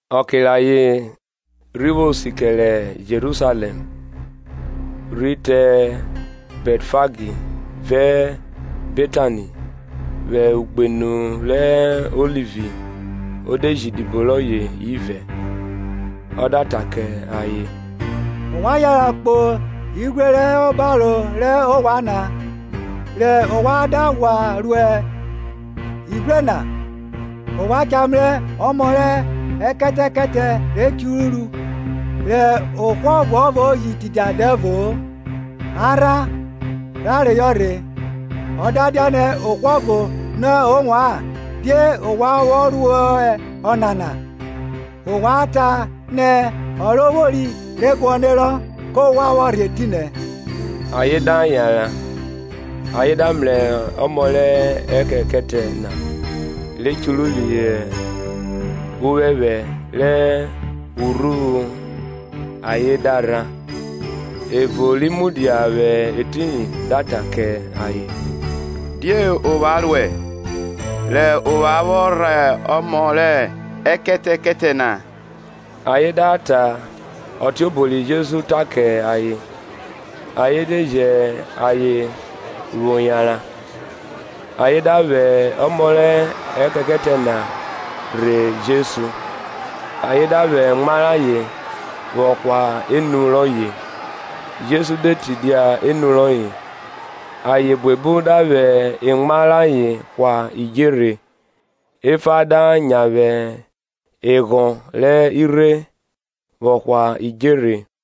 Ọke re ayen rhi vwo sikẹre Jerusalẹm, rhi te Bẹtfagi vẹ Betani, vwẹ ugbenu rẹ Ọlivi o de ji idibo rọye ivẹ, Ọ da ta kẹ ayen, ovwan yanran kpo ighwre rọ hẹ obaro rẹ ovwan na; rẹ ovwan da ghwa ro ighwre na, ovwan cha mrẹ ọmọ rẹ ekẹtẹkẹtẹ re churu, rẹ ohwo ọvuọvo ji tidia dẹvo-o, a rhan, ra reyọ rhe. Ọ da dianẹ ohwo ọvo nọ ovwan, Die ovwan vwo ruẹ ọnana? Ovwan ta nẹ, Ọrovwori re guọnerọ, kọ ghwa vwọ rhe etinẹ. Ayen da yanran, ayen da mrẹ ọmọ rẹ ekẹtẹkẹtẹ na re churu phihọ uphẹphẹ rẹ urhuvwu ayen da rhan. Ẹvo ri mudia vwẹ etiyin da ta kẹ ayen, Die ovwan ruẹ, re ovwan vwọ rhan ọmọ rẹ ekẹtẹkẹtẹ na? Ayen da ta ọtiobo ri Jesu ta kẹ ayen; ayen de jẹn ayen vwọ yanran. Ayen da vwẹ ọmọ rẹ ekẹtẹkẹtẹ na rhe Jesu, ayen da vwẹ emwa rayen vwọ hwa enu rọye; Jesu de tidia enu rọye. Ayen buebu da vwẹ emwa rayen hwa idjerhe; efa da nyavwe eghọn rẹ irhe, vwọ hwa idjerhe.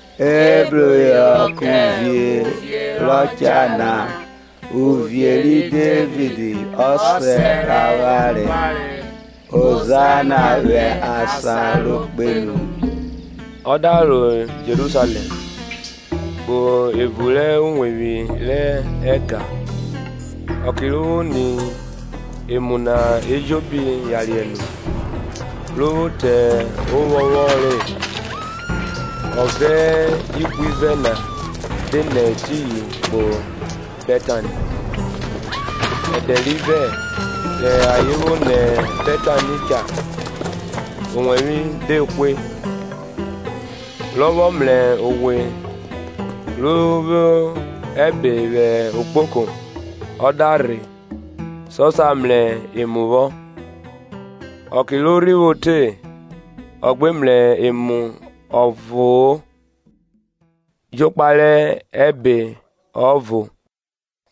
Ebruphihọ kẹ uvie rọ cha na, uvie ri Devid ọsẹ rẹ avwanre; Hozanna vwẹ asan ro kpenu. Ọ da ro Jerusalẹm, kpo evun rẹ uwevwi rẹ ẹga; ọke ro vwo ni emu na ejobi yariẹ nu, ro vwo te ovwọnvwọn re, ọ vẹ ihwivẹ na de nẹ etiyin kpo Bẹtani. Ẹdẹ rivẹ, rẹ ayen vwo nẹ Bẹtani cha, owẹvwe de hwe. Rọ vwọ mrẹ owe ro vwo ẹbe vwẹ ogboko, ọ da rhe sọ sa mrẹ emu vwọ; ọke ro rhi vwo te, ọ gbe mrẹ emu ọvo-o; jokpa rẹ ẹbe ọvo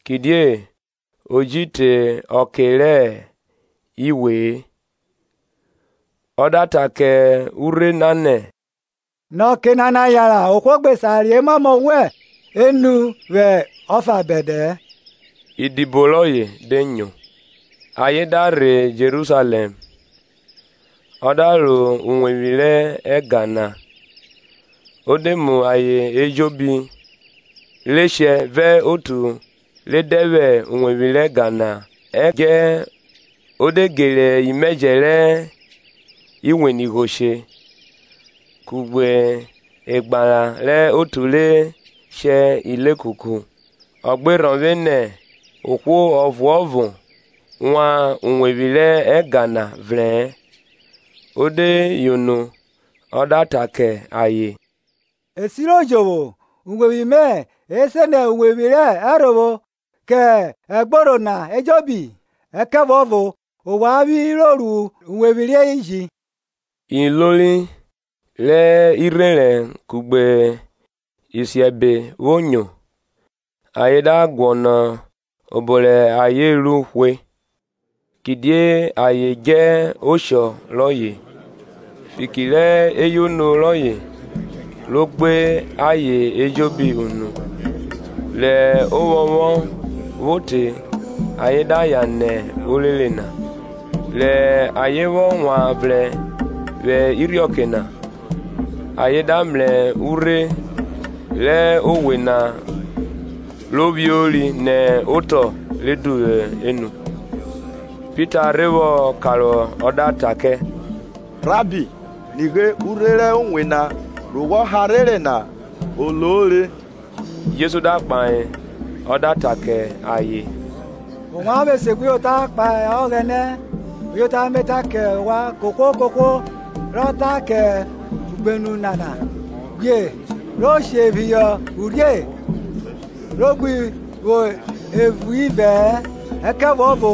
kidie o ji te ọke rẹ iwe-e. Ọ da ta kẹ urhe na nẹ, nẹ ọke nana yanran ohwo gbe sa re emamọ vwẹ enu wẹn ọfa bẹdẹ-ẹ. Idibo rọye de nyo. Ayen da rhe Jerusalẹm; ọ da ro uwevwi rẹ ẹga na, o de mu ayen ejobi re shẹ vẹ otu re dẹ vwẹ uwevwi rẹ ẹga na họ ẹdjẹ, o de gere imẹjẹ rẹ iwenigho she, kugbe egbara rẹ otu re shẹ ilekuku; Ọ gbe rhọvwe nẹ ohwo ọvuọvo wan uwevwi rẹ ẹga na vrẹ-ẹn. O de yono, ọ da ta kẹ ayen, E siro jovwo, uwevwi mẹ e se nẹ uwevwi rẹ ẹrhovwo kẹ ẹgborho na ejobi? ẹkẹvuọvo ovwan vwi ro ru uwevwi rẹ iji. Ilori rẹ irherẹn kugbe isiẹbe vwo nyo, ayen da guọnọ obo rẹ ayen ru hwe; kidie ayen djẹ oshọ rọye, fiki rẹ eyono rọye ro gbe ayen ejobi unu. Rẹ ovwọnvwọn vwo te ayen da yan nẹ orere na. Rẹ ayen vwọ wan vrẹn vwẹ irhiọke na, ayen da mrẹ urhe rẹ owe na ro lori nẹ otọ re duvwu enu. Pita rhe vwọ karohọ ọ da ta kẹ, Rabbi, nigbe, urhe rẹ owe na re wọ harhere na o lo re. Jesu da kpahe ọ da ta kẹ ayen, ovwan vwo esegbuyota kpahe Ọghẹnẹ. Uyota Me ta kẹ ovwan kohwo kohwo rọ ta kẹ ugbenu nana, Ghwie re she phihọ urhie, ro gbi vwo evun ivẹ-ẹ, ẹkẹvuọvo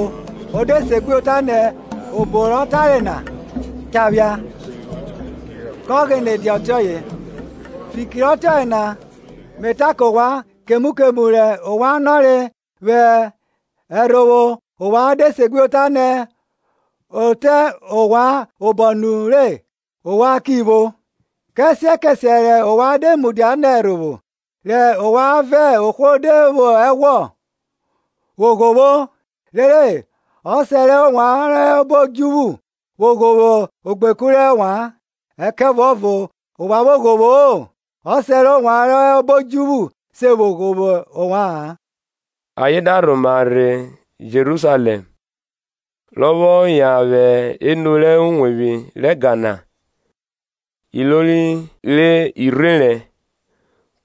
o de segbuyota nẹ obo rọ tare na cha phia, kọ ghene dia ọtiọye. Fiki rẹ ọtiọye na Me ta kẹ ovwan, kemu kemu rẹ ovwan nọre vwẹ ẹrhovwo ovwan de segbuyota nẹ o te ovwan obọ nure ovwan ki vwo. Kẹsiẹ kẹsiẹ rẹ ovwan de mudia nẹ ẹrhovwo, rẹ ovwan vẹ ohwo de vwo ẹghwọ, vwo ghovwo; rere Ọsẹ rẹ ovwan rọ hẹ obo odjuvwu vwo ghovwo ogbeku rẹ ovwan. Ẹkẹvuọvo ovwan vwo ghovwo-o Ọsẹ rẹ ovwan rọ hẹ obo odjuvwu ji se vwo ghovwo ovwa-an. Ayen da rhoma rhe Jerusalẹm; rọ vwọ yan vwẹ evun rẹ uwevwi rẹ ẹga na, ilori re irherẹn,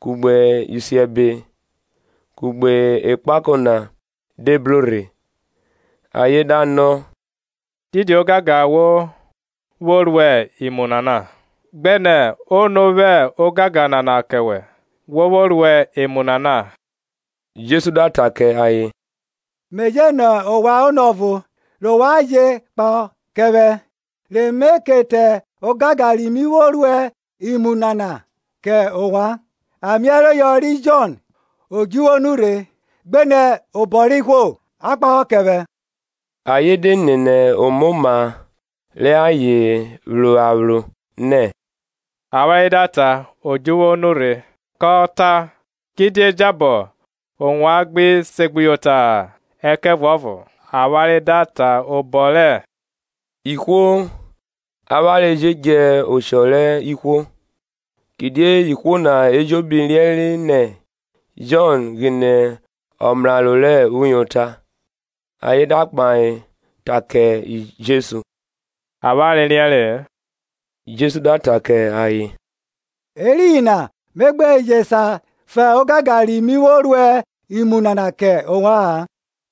kugbe isiẹbe, kugbe ekpako na de bro rhe; ayen da nọ, didi ogangan wo vwo ruẹ imu nana? gbenẹ ono vwẹ ogangan nana kẹ wẹ wo vwo ruẹ imu nana? Jesu da ta kẹ ayen, mẹ je nọ ovwan onọ ọvo, re ovwan jẹ kpahọ kẹ vwẹ, re Me ke ta ogangan ri mi vwo ruẹ imu nana kẹ ovwan. Amẹ-ereyọ ri Jọn, odjuvwu o nurhe, gbenẹ obọ rẹ ihwo? A kpahọ kẹ vwẹ. Ayen de nene omoma rẹ ayen phro aphro, nẹ, Avwanre da ta, Odjuvwu o nurhe, kọ ta kidie jabọ ovwan gbi segbuyota-a? Ẹkẹvuọvo avwanre da ta obọ rẹ ihwo avwanre jẹ djẹ oshọ rẹ ihwo; kidie ihwo na ejobi riẹnre nẹ Jọn ghine ọmraro rẹ uyota. Ayen da kpahe ta kẹ Jesu, Avwanre riẹnre-e. Jesu da ta kẹ ayen, Ẹriyin na Me gbe je sa fan ogangan ri mi vwo ruẹ imu nana kẹ ovwa-an.